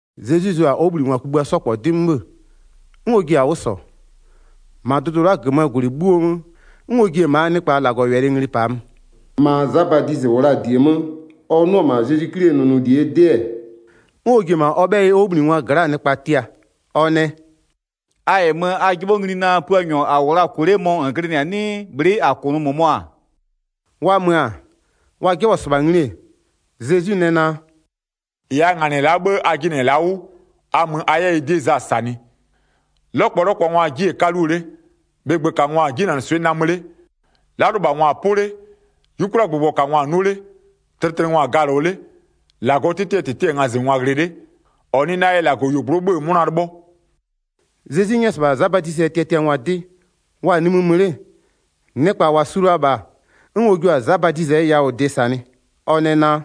Zezwi zʋ-a ɔ 'wʋbhlinɩngwa kugbïa 'sɔ -kpɔ 'dɩ 'mö 'bhë, 'n ɔ ji-a 'wʋ -sɔ, -ma dʋdʋ la'a -gömöö -gwlɩ 'bhuo 'mö, 'n ɔ ji-e -maa nɩkpa -Lagɔwɛlɩ ngli -paa mö. Ma Za Badizɩ -wʋ la-a -die 'mö ɔ 'nʋ-ɔ -ma Zezwi 'Klie nʋnʋlie 'dɩ-ɛ, 'n ɔ ji-e -ma ɔ 'bhɛyɩ ɔ 'wʋbhlinɩngwa gla'aa nɩkpa tia. Ɔ nɛ: “A -yɛ mö, a 'jɩbhɔ ngli naa: Puanyɔ -a -wʋ la-a -kʋnʋ 'le mɔ -n glɩnɩ-a 'nɩɩ, bhlɩ'ɩ -a -kʋnʋ -mʋmɔ-a?” Wa mö-a, wa 'jɩbhɔ-ɔ -sɩbha ngli-e, Zezwi nɛ naa: “-Ɩ a -nganɩ-ɛ la'a 'bhë a jɩnɩ-ɛ la'a 'wʋ, a mö a 'yɛ ɩ 'dɩ Za -sanɩ. 'Lɔkpɔlɔkpɔngwaa 'jie-e 'kaluo 'le, bhɩgbökangwa-a 'jinanɩswɩ'ɩ namö 'le, 'lalʋlɩbhangwa-a 'pʋ 'le, 'yukwliagbʋgbɔkangwa-a 'nʋ 'le, tlɩtlɩngwa-a galɔ 'le, -Lagɔɔ 'tɩtɩɛ -tɩtɩ-ɛ ngazɩngwa ghlɩ 'le. 6-Ɔ nɩ na yɛ -Lagɔyuogblʋ'ʋ 'bhö-ö 'mʋna 'lɩbhɔ.” Zezwi 'nyɛ-ɛ -sɩbha Za Badizɩɛ tiatiangwa 'dɩ, wa-a nimï mö 'le, nɩkpa -wa su la-a -bha, 'n ɔ jua-a Za Badizɩɛ yawʋdɩ -sanɩ. Ɔ nɛ naa: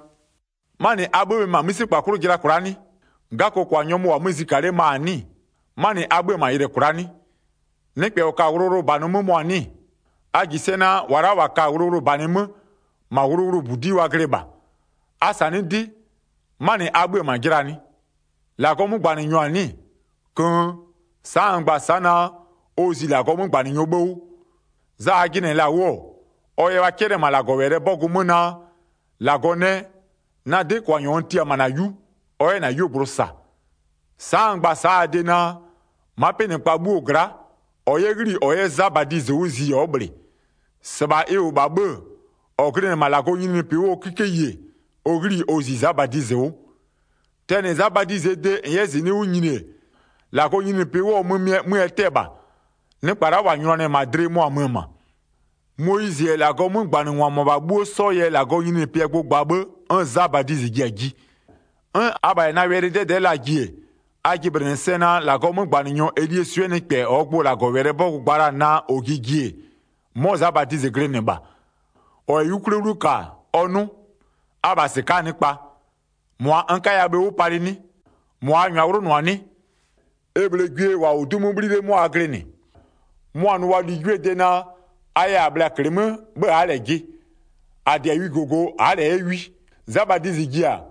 “'Manɩ a 'bhö-ö bhe -ma 'mïsekpa 'klʋ jɩla kwla'a 'nɩ? 'Gakokwa nyɔmʋ -wʋ-a 'mö zika 'le ma-a 'nɩ-ɩ? 'Manɩ a 'bhö-ö -ma yɩlɩ kwla'a 'nɩ? Nɩkpɛ -ɔ ka-a wʋlʋwʋlʋbanɩ 'mö mɔ-a 'nɩ-ɩ? A -ji sɛ naa, -wa la'a -wa ka-a wʋlʋwʋlʋbanɩ 'mö, -ma wʋlʋwʋlʋbudi'i wa glɩ -bha. A -sanɩ'ɩ 'dɩ, 'manɩ a 'bhö-ö -ma jɩlaa 'nɩ? -Lagɔɔ 'mögbanɩnyɔ-a 'nɩ-ɩ? Köön sa'a n gba-a sa'a naa: Ɔ zi -Lagɔɔ 'mögbanɩnyɔɔ 'bhë 'wʋ. Za a jɩnɩ-ɛ -la 'wʋ-ɔ, ɔ yɛ wa 'cɛlɩ-ɛ -ma -Lagɔwɛlɩɛ 'bɔgʋ 'mö naa: -Lagɔ nɛ, na 'dɩkwanyɔ n tia-a -ma -na 'yu, ɔ 'yɛ -na 'yuogblʋ -sa. Sa'a n gba-a sa'a a de naa: Ma'a 'pɩnɩkpa 'bhuo gla'a, -ɔ 'yɛ 'ghli-i -ɔ 'yɛ Za Badizɩ 'wʋ zi ɔ'ɔ -bhlɩ. -Sɩbha ɩ -wʋ -bha 'bhë-ë, -ɔ glɩnɩ-ɛ -ma -Lagɔɔ nyininyinipɩ 'wʋɔ 'kikeyi ɔ 'ghli-i ɔ zi Za Badizɩ 'wʋ. Tɛnɩ Za Badizɩɛ de -n 'yɛ -zɩnɩ'ɩ 'wʋ nyini-e, -Lagɔɔ nyininyinipɩ 'wʋɔ mömɩɛ, 'mö ɛ 'tɛ-ɛ -bha. Nɩkpa la'a -wa nyʋnanɩ-ɛ -ma dlɩ mʋa-a mö-ö -ma. Moyizɩ -yɛ -Lagɔɔ 'mögbanɩngwa -mʋabha 'bhuo 'sɔ yɛ -Lagɔɔ nyininyinipɩɛ gbʋ gba 'bhë, 'n Za Badizɩ ji-a ji. 'N abha -yɛ na wɛlɩ 'dɛdɛ'ɛ laa ji-e, a jɩblɩnɩ sɛ naa -Lagɔɔ 'mögbanɩnyɔ Elie swɩ'ɩɛ nɩkpɛ -ɔɔ gbʋ -Lagɔwɛlɩɛ 'bɔgʋ gba la-a naa -ɔ ji ji-e, 'mɔ Za Badizɩ glɩnɩ -bha. 15-Ɔ -yɛ 'yukwlie 'wlu -ka, ɔ 'nʋ. Abha -sɩka'aa nɩkpa, -mʋa n 'kaya bhe 'wʋ palɩ 'nɩ? -Mʋa a -nyʋa 'wlʋnʋ-a 'nɩ? E -bhlee gwie -wa -wʋ 'du 'mö 'bhli 'le 'mʋa a glɩnɩ, mʋa-a nʋ wa ligwiee de naa: A yɛ -a bhlɩ-a -klɩmö 'bhë a'a -lɛ jɩ, -a -dɩ-a wijogo, a'a -lɛ 'yɛ wi. Za Badizɩ ji-a,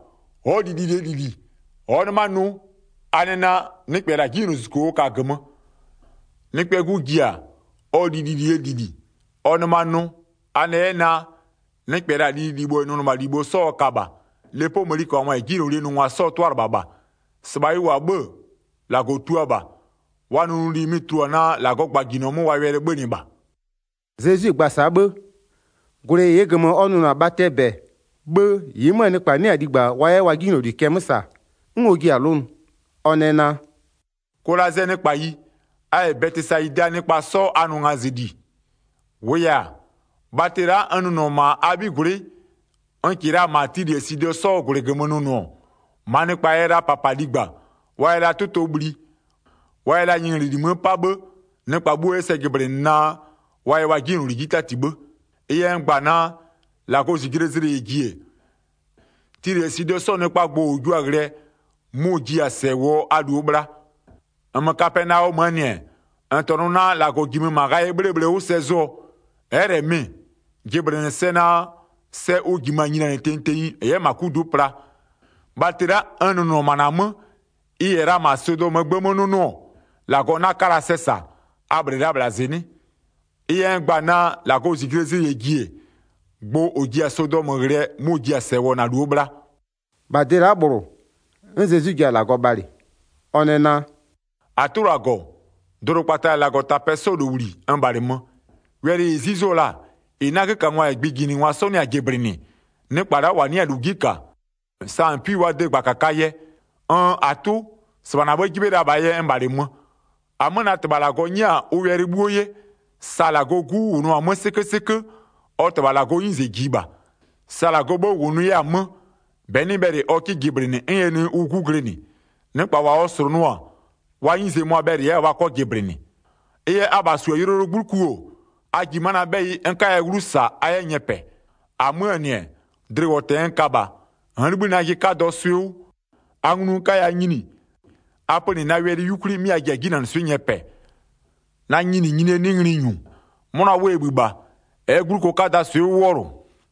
ɔ'ɔ li lilie -lili, ɔ'ɔ 'nɩma nʋ, a nɛ naa: Nɩkpɛ -la 'jinylozuzuko ɔ ka-a -gömö. Nɩkpɛɛ 'Gu ji-a, ɔ li lilie -lili, ɔ nɩma nʋ, a nɛ 'yɛ naa: Nɩkpɛ -la lililibho -yɛ nʋnɩmalibho 'sɔ ɔ ka -bha. Lepoo mëniköbhangwa -yɛ 'jinylolie nʋngwa 'sɔɔ 'tʋalɩbha -bha. -Sɩbha ɩ -wʋ-a 'bhë, -Lagɔ tua -bha. Wa nʋnʋli mɩ-ɩ tulua-a naa -Lagɔɔ gbajinɔ 'mö wa wɛlɩ 'bhönɩ -bha.” Zezwi gba-a sa'a 'bhë, -gwlɩ -ɩɩ -gömö ɔ nʋnʋ-a bhatɩɛ -bɛ 'bhë -ɩɩ 'möö nɩkpa 'nɩ-a ligba wa 'yɛ wa 'jinyloli cɛ 'mö -sa, 'n ɔ jiɩ-a 'lʋnʋ. Ɔ nɛ naa: “Kolazɩɛɛ nɩkpayi, a -yɛ Bɛtɩsayidaa nɩkpa 'sɔ a nʋ ngazɩli. -Wʋʋ yɛ-a, bhatɩ la'a n nʋnʋ-ɔ -ma a 'bhigwlɩ'ɩ, n -kɩɩ la -ma Tilɩ -yɛ Sidɔ 'sɔɔ -gwlɩ -gömö nʋnʋ-ɔ, -maa nɩkpa yɛ la -papa ligba, wa yɛ la 'tʋtɔ bhli, wa yɛ la nyɩnglɛli 'mö 'pa 'bhë, nɩkpa 'bhuo 'yɛ sɛ jɩblɩnɩ naa, wa yɛ wa 'jinyloli 'ji 'tati 'bhë. Ɩ yɛ n gba-a naa, -Lagɔɔ -zijlee zlɩ -yɛ ji-e, Tilɩ -yɛ Sidɔ 'sɔɔ nɩkpaa gbʋ -ʋ jua-a ghlɩɛ mʋ-ʋ ji-a -sɛ -wʋɔ a -luo bhla. 23-Nmö Kapɛnaɔmöö -nɩ-ɛ, -n -tɔnʋ naa -Lagɔ -jimö -ma ghayɩɛ 'bhlee bhle 'wʋ sɛ zʋɔ, ɛ'ɛ -lɛ mɩ-ɩ, jɩblɩnɩ sɛ naa sɛ ʋ -jimö-a nyinia tenyi tenyi -n 'yɛ -ma 'kudu'u pla. Bhatɩ la'a n nʋnʋ-ɔ -ma -na 'mö, ɩ -yɛ la -ma Sodɔmöö gbë 'mö 'nʋnʋɔ, -Lagɔ 'na 'ka la sɛ -sa, a -bhlɩ la -bhla -zɩnɩ'ɩ. Ɩ yɛ n gba-a naa, -Lagɔɔ -zijlee zlɩ -yɛ ji-e, gbʋ -ʋ ji-a Sodɔmö ghlɩɛ mʋ-ʋ ji-a -sɛ -wʋɔ -na -luo bhla.” -Wa 'nɩ-a -lu 'ji -ka 'mʋa -Lagɔ nyɛ-a ʋ 'tɩtɩɛ -tɩtɩ 25-Bha de la'a -bhlʋ, 'n Zezwi ji-a -Lagɔ bhalɩ, ɔ nɛ naa: “-Atʋ -Lagɔ, dʋdʋkpata -yɛ -Lagɔtapɛ 'sɔɔ -lowli, n -bhalɩmö. Wɛlɩ -ɩ 'zuzo-o la-a, -ɩ 'nagökangwa -yɛ gbɩjinɩngwa 'sɔ 'nɩ-a jɩblɩnɩ, nɩkpa la'a -wa 'nɩ-a -lu 'ji -ka, sa -n 'pui-a wa de -gbakakaa yɛ. Nn -Atʋ, -sɩbha -na 'bhë 'jɩbhɩ la -bhaa yɛ n -bhalɩmö. 27-Amö na -Tɩbha -Lagɔ 'nyɛ-a ʋ wɛlɩ 'bhuo 'ye, sa -Lagɔɔ 'Gu -wʋnʋ-a 'mö 'sɩkö 'sɩkö, ɔ -Tɩbha -Lagɔɔ 'nyize -jiɩ -bha. Sa ɔ -Tɩbha -Lagɔɔ 'bhë -wʋnʋ 'yɛ-a 'mö -bɛ 'nɩ bhɛlɩ ɔ 'kɩ jɩblɩnɩ 'n ɛ nɩ ʋ 'Gu glɩnɩ. Nɩkpa -wa ɔ -slʋnʋɔ-a, wa 'nyize mʋa-a bhɛlɩ 'yɛ-a wa 'kɔ jɩblɩnɩ. Ɩ yɛ abha -su-a yʋlɔyʋlʋɔ 'gbluku-o, a ji ma'a na 'bhɛyɩ n 'kaya 'wlu -sa, a 'yɛ nyɛpɛ. 29-Amöö -nɩ-ɛ, dlɩwɔtɛ n ka -bha, n'n 'libhï najɩ 'kadɔɔ swɩ'ɩ 'wʋ, a nglu n 'kaya nyini, a pönɩ na wɛlɩ 'yukwli 'mɩ a ji-a 'jinanɩswɩ'ɩ nyɛpɛɛ. Na nyininyinie 'nɩ ngli -nyu, 'mʋna 'wʋ ɛ -bhï -bha, ɛ'ɛ 'gbluko 'kadaa swɩ'ɩ 'wʋ 'wɔlʋ.”